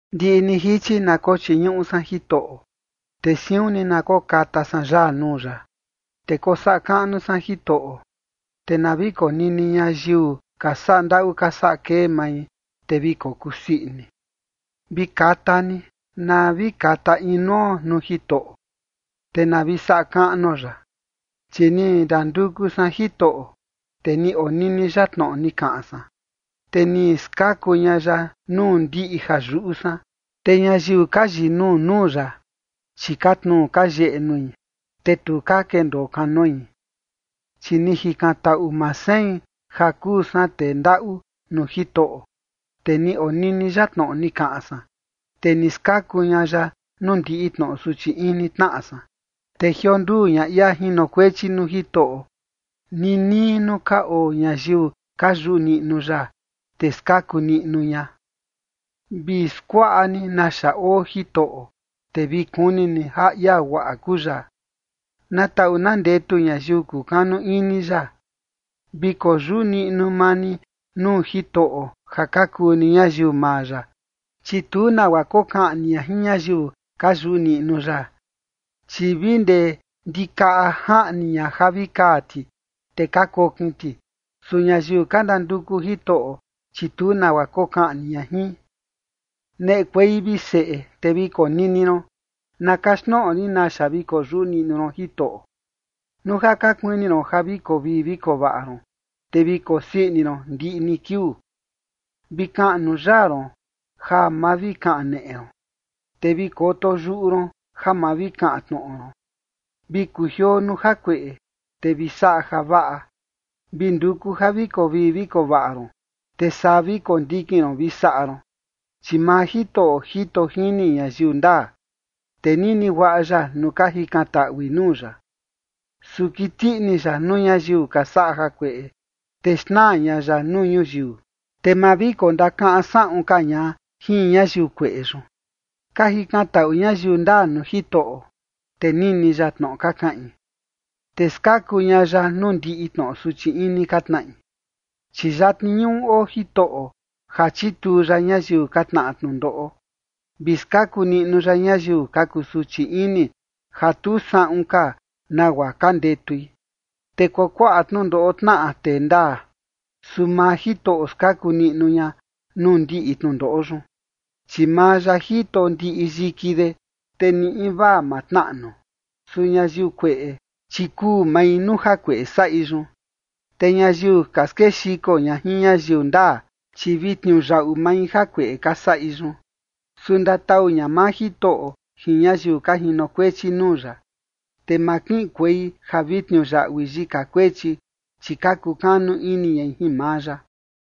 Ndiꞌi ni jichi na kochiñuꞌu san Jitoꞌo, te siun ni na kokata san yaa nuu ya. Te kosaꞌa kaꞌnu san Jitoꞌo, te na vi konini ñayiu ka saꞌa ndaꞌu ka saꞌa kei mai, te vi kokusii ini. Vi kata ni, na vi kata inuo nuu Jitoꞌo, te na vi saꞌa kaꞌnuo ya. Chi ni ndanduku san Jitoꞌo, te ni onini ya tnoꞌo ni kaꞌan san, te ni skaku ña ya nuu ndiꞌi ja yuꞌu san. Te ñayiu ka yinuu nuu ya, chi ka tnuu ka yeꞌe nui, te tu ka kendoo kanoi. Chi ni jikantaꞌu maa sein ja kuu san tee ndaꞌu nuu Jitoꞌo, te ni onini ya tnoꞌo ni kaꞌan san, te ni skaku ña ya nuu ndiꞌi tnoꞌo suchi ini tnaꞌa san. Te jionduu ña ia jinokuechi nuu Jitoꞌo ninii nuu ka oo ñayiu ka yuꞌu niꞌnu ya, te skaku niꞌnu ña. Vi skuaꞌa ni naxa oo Jitoꞌo, te vi kuni ni ja ia guaꞌa kuu ya. ¡Na taꞌu na ndetu ñayiu kukanu ini ya! Vi koyuꞌu niꞌnu maa ni nuu Jitoꞌo ja ka kuu ni ñayiu maa ya, chi tu nagua kokaꞌni ña jin ñayiu ka yuꞌu niꞌnu ya. Chi vi ndee ndikaꞌa jaꞌni ña ja vi kaa ti, te ka kokin ti, su ñayiu ka ndanduku Jitoꞌo, chi tu nagua kokaꞌni ña jin. Neꞌekuei, vi seꞌe, te vi konini ron, na kaxtnoꞌo rin naxa vi koyuꞌu niꞌnu ron Jitoꞌo. Nuu ja ka kuini ron ja vi koo vii vi koo vaꞌa ron, te vi kosii ini ron ndiꞌi ni kiuu, vi kaꞌnu yaa ron ja ma vi kaneꞌe ron te vi koto yuꞌu ron ja ma vi kaꞌan tnoꞌo ron. Vi kujioo nuu jakueꞌe, te vi saꞌa javaꞌa, vi nduku ja vi koo vii vi koo vaꞌa ron, te saa vi kondikin ron vi saꞌa ron. Chi maa Jitoꞌo jito jini ñayiu ndaa, te nini guaꞌa ya nuu ka jikantaꞌui nuu ya. Su kiti ini ya nuu ñayiu ka saꞌa jakueꞌe, te xnaa ña ya nuu ñuyiu, te ma vi kondakaꞌan saꞌun ka ña jin ñayiu kueꞌe yun. Ka jikantaꞌu ñayiu ndaa nuu Jitoꞌo, te nini ya tnoꞌo ka kaꞌin, te skaku ña ya nuu ndiꞌi tnoꞌo suchi ini ka tnaꞌi. Chi yatni ñuꞌu oo Jitoꞌo ja chituu ya ñayiu ka tnaꞌa tnundoꞌo, vi skaku niꞌnu ya ñayiu ka kusuchi ini, ja tu saꞌun ka nagua ka ndetui. Te kuakuaꞌa tnundoꞌo tnaꞌa tee ndaa, su maa Jitoꞌo skaku niꞌnu ña nuu ndiꞌi tnundoꞌo yun. Chi maa ya jito ndiꞌi yiki de, te ni invaa ma tnaꞌnu. Su ñayiu kueꞌe, chi kuu mai nuu jakueꞌe saꞌi yun, te ñayiu ka skexiko ña jin ñayiu ndaa, chi vi tniuyaꞌu mai jakueꞌe ka saꞌi yun. Su ndatau ña maa Jitoꞌo jin ñayiu ka jinokuechi nuu ya, te ma kiꞌinkuei ja vi tniuyaꞌui yika kuechi, chi ka kukanu ini ñai jin maa ya.